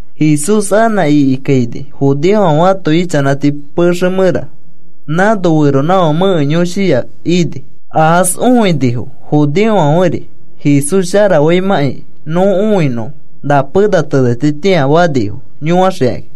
Jesús anã ikikaini judeofãfe ãto ichanãti pexe mẽra. Nãno feronãfake mẽke yõshiya ini. Aas õinifo, judeofãferi. “Jesús sharafaimãkai nõ õinõ na pena tenetitĩa,” fanifo yõaxikakĩ.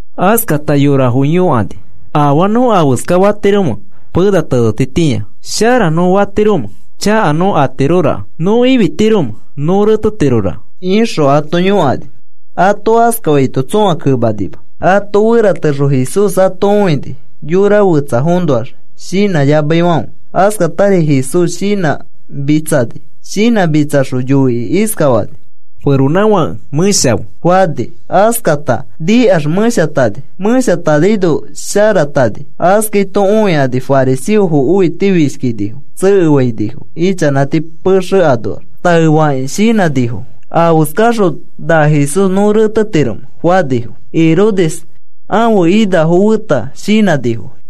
Askata yorafo yõkani: “¿Afaa nõ afeska fatiromẽ pena tenetitĩa? ¿Shara nõ atiromẽ? ¿Chaka nõ atiroraka? ¿Nõ ifitiromẽ? ¿Nõ retetiroraka?” ixõ ato yõkani. Ato askafaito tsõa kemanima. Ato feratexõ Jesús ato õini, yora fetsafoõnoax shinãyamaifãfe. Askatari Jesús shinãmitsani. Shinãmitsaxõ yoikĩ iskafani feronãfake: “Mẽshafe,” fani. Askata nikax mẽshatani. Mẽshatanaino sharatani. Askaito õikani fariseofo õitifishkinifo. Tsekefainifo ichanãti pexe anoax. Taefakakĩ shinãnifo: “¿Afeskafaxõ na Jesús nõ retetiromẽ?” fanifo. Herodes ãfe inafo feta shinãnifo.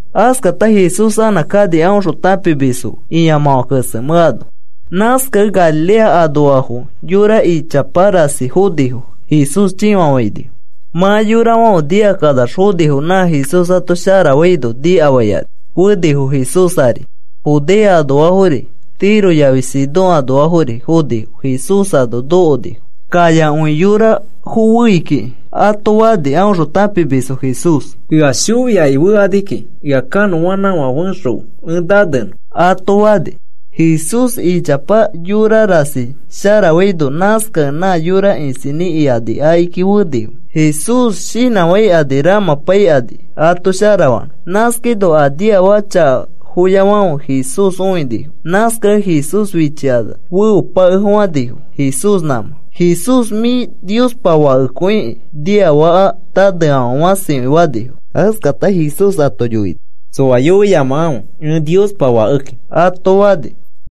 Askata Jesús anã kani aõxõ tãpimisfo fe ĩamãfã kesemẽ ano. Nãskakẽ Galilea anoafo yora ichapa rasi fonifo. Jesús chĩfafainifo. Mã yorafãfe nikakanax fonifo, nã Jesús ato sharafaino nikafaikani fonifo Jesús ari. Judea anoafori, Tiro yafi Sidón anoafori fonifo. Jesús ano nokonifo. “Kayakõi yorafo fei kiki,” ato fani aõxõ tãpimisfo Jesús. “Ea shoi aki fetirofoki, ea kanõa fexokãfe ẽ nanenõ,” ato fani. Jesús ichapa yora rasi sharafaino, nãskakẽ na yora isinĩ ikani akiki fenifo Jesús shinãfãikani ramãpaikani ato sharafanõ. Nãskaino a niafaka chakafoyafãfe Jesús õinifo. Nãskakẽ Jesús fichikanax feopakefofãnifo Jesús nãmã. “Jesús mĩ Niospa Fakekõiki,” niafaka naneafãfe fãsikõi fanifo. Askata Jesús ato yoini: “Tsoa yoiyamakãfe ẽ Niospa Fakeki,” ato fani.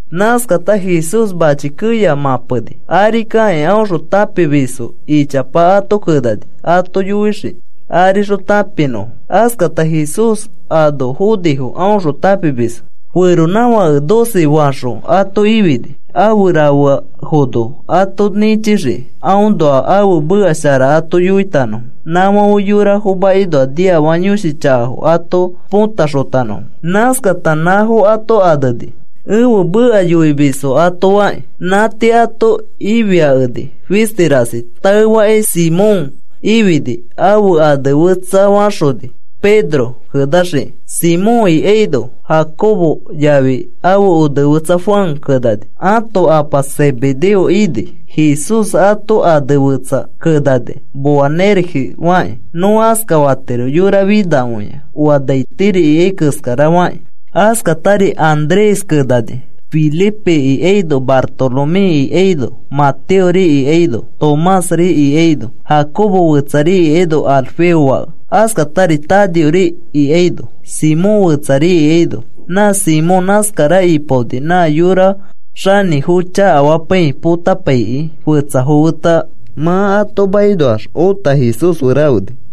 Nãskata Jesús mãchi keya mãpeni. Ari kakĩ aõxõ tãpimisfo ichapa ato kenani ato yoixiki arixõ tãpinõfo. Askata Jesús ano fonifo aõxõ tãpimisfo. Feronãfake doce faxõ ato ifini, afe rafeafono ato nĩchixiki aõnoa ãfe meka shara ato yoitanõfo, nãfãfe yorafo makinoa niafaka yõshi chakafo ato potaxotanõfo. Nãskata nãfo ato aneni, “Ẽfe meka yoimisfo” ato fakĩ. Nã tii ato ifipakeni fisti rasi. Taefakĩ Simón ifini. Ãfe ane fetsafaxoni, Pedro kenaxiki. Simón ikaino, Jacobo yafi ãfe onefetsa Juan kenani, ãto apa Zebedeo ini. Jesús ato ane fetsa kenani Boanerges fakĩ. Nõ askafatiro, “Yora finakõia oa nai tiri ikai keskara” fakĩ. Askatari Andrés kenani, Felipe ikaino, Bartoloméri ikaino, Mateori ikaino, Tomásri ikaino, Jacobo fetsari ikaino, Alfeo fake. Askatari Tadeori ikaino, Simón fetsari ikaino. Na Simón nãskara ipaoni nã yora xanĩfo chakafapaikĩ, potapaikĩ fetsafo feta. Mã ato makinoax ota Jesús fe rafeni.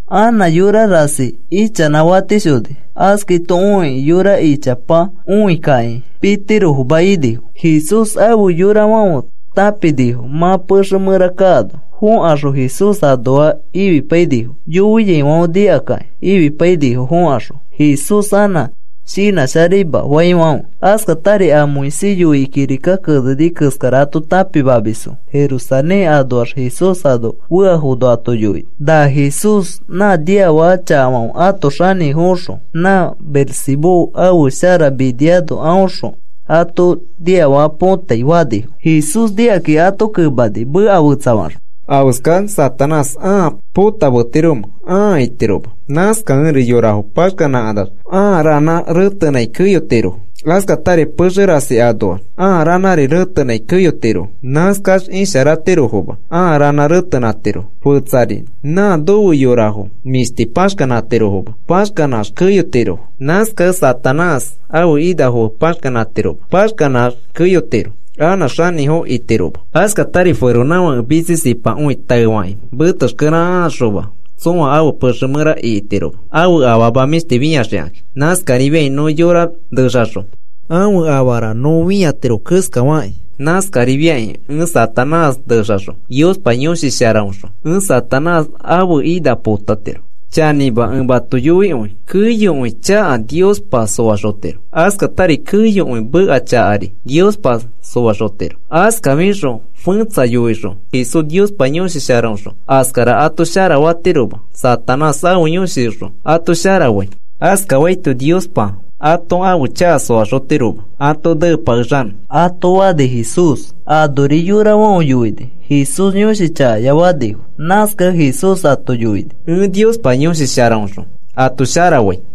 Anã yora rasi ichanãfatishoni. Askaito õikĩ, yora ichapa õikĩkakĩ, pitirofoma inifo. Jesús afe yorafãfe tãpinifo mã pexe mẽra kaano fõkaxõ Jesús anoa ifipainifo. Yoiaifãfe nikakakĩ ifipainifo fõkaxõ Jesús anã shinãsharaima faifãfe. Askatari a Moisés yoikĩ kirika keneni keskara ato tãpimamisfo Jerusalén anoax Jesús ano feafono ato yoini: “Na Jesús nã niafaka chakafãfe ãto xanĩfoõxõ nã Beelzebú ãfe shara miniano aõxõ ãto niafaka põtai,” fanifo. Jesús nikakĩ ato kemani meka fetsafaxõ: “¿Afeskax Satanás ãa potametiromẽ? Ãa itiroma. Nãskakẽri yorafo paxkanãkanax ãa ranã retenãi keyotirofo. Askatari pexe rasi anoax ãa ranã retenãi keyotirofo. Nãskax isharatirofoma ãa ranã retenãtirofo. Fetsari nã nofe yorafo mĩshti paxkanãtirofoma. Paxkanãx keyotirofo. Nãskakẽri Satanás ãfe inafo fe paxkanãtiroma. Paxkanãx keyotiro anã xanĩfo itiroma. “Askatari feronãfake mitsisipakõi taefakĩ metexkere akaxoma tsoa ãfe pexe mẽra ikitiroma ãfe afama mĩshti fĩaxikakĩ. Nãskarifiakĩ nõ yora nexaxõ ãfe afara nõ fĩatiro keskafakĩ, nãskarifakĩ ẽ Satanás nexaxõ Niospa Yõshi Sharaõxõ ẽ Satanás ãfe ina põtatiro. “Chanĩma ẽ mato yoikõi, keyokõi chaka Niospa soaxotiro. Askatari keyokõi meka chakari Niospa soaxotiro. Askafixõ fẽtsa yoixõ, ‘Jesús Niospa Yõshi Sharaõxõ askara ato sharafatiroma, Satanás ãfe yõshioxõ ato sharafai,’ askafaito Niospa ato ãfe chaka soaxotiroma, ãto neepakexanõ,” ato fani Jesús. Anori yorafãfe yoini: “Jesús yõshi chakaya,” fanifo. Nãskakẽ Jesús ato yoini Epa Niospa Yõshi Sharaõxõ ato sharafai.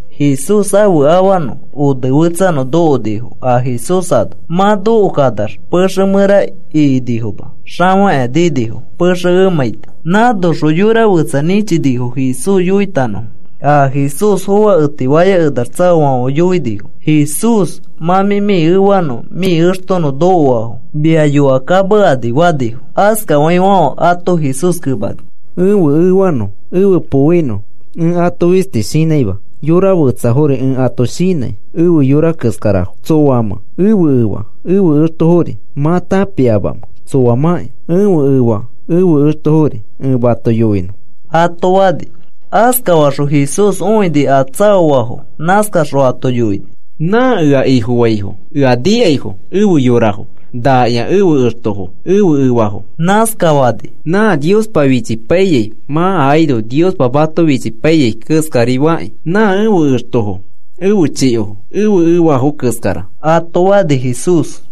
Jesús ãfe afanõ onefetsanõ nokonifo a Jesús ano. Mã nokokanax pexe mẽra ikinifoma. Xafakĩa ninifo pexe emãiti. Nãnoxõ yora fetsa nĩchinifo Jesús yoitanõfo. A Jesús foaketifaya kekanax tsaoafãfe yoinifo: “Jesús, mã mĩ efanõ mĩ extonõ nokoafo. Mia yõkakamekani,” fanifo. Askafaifãfe ato Jesús kemani: “Ẽfe efanõ, ẽfe poinõ, ẽ ato fistis shinãima. Yora fetsafori ẽ ato shinãi efe yora keskarafo. ¿Tsoamẽ ẽfe efa, ẽfe extofori? ¿Mã tãpipaimẽ tsoamãki ẽfe efa, ẽfe extofori? Ẽ mato yoinõ,” ato fani. Askafaxõ Jesús õini a tsaoafo. Nãskaxõ ato yoini: “Nã ea Ifofaifo, ea nikaifo efe yorafo. Nakĩa ẽfe extofo, ẽfe efafo,” nãskafani. “Nã Niospa fichipaiyai mã akaino Niospa mato fichipaiyai keskarifakĩ nã ẽfe extofo, ẽfe chikofo, ẽfe efa keskara,” ato fani Jesús.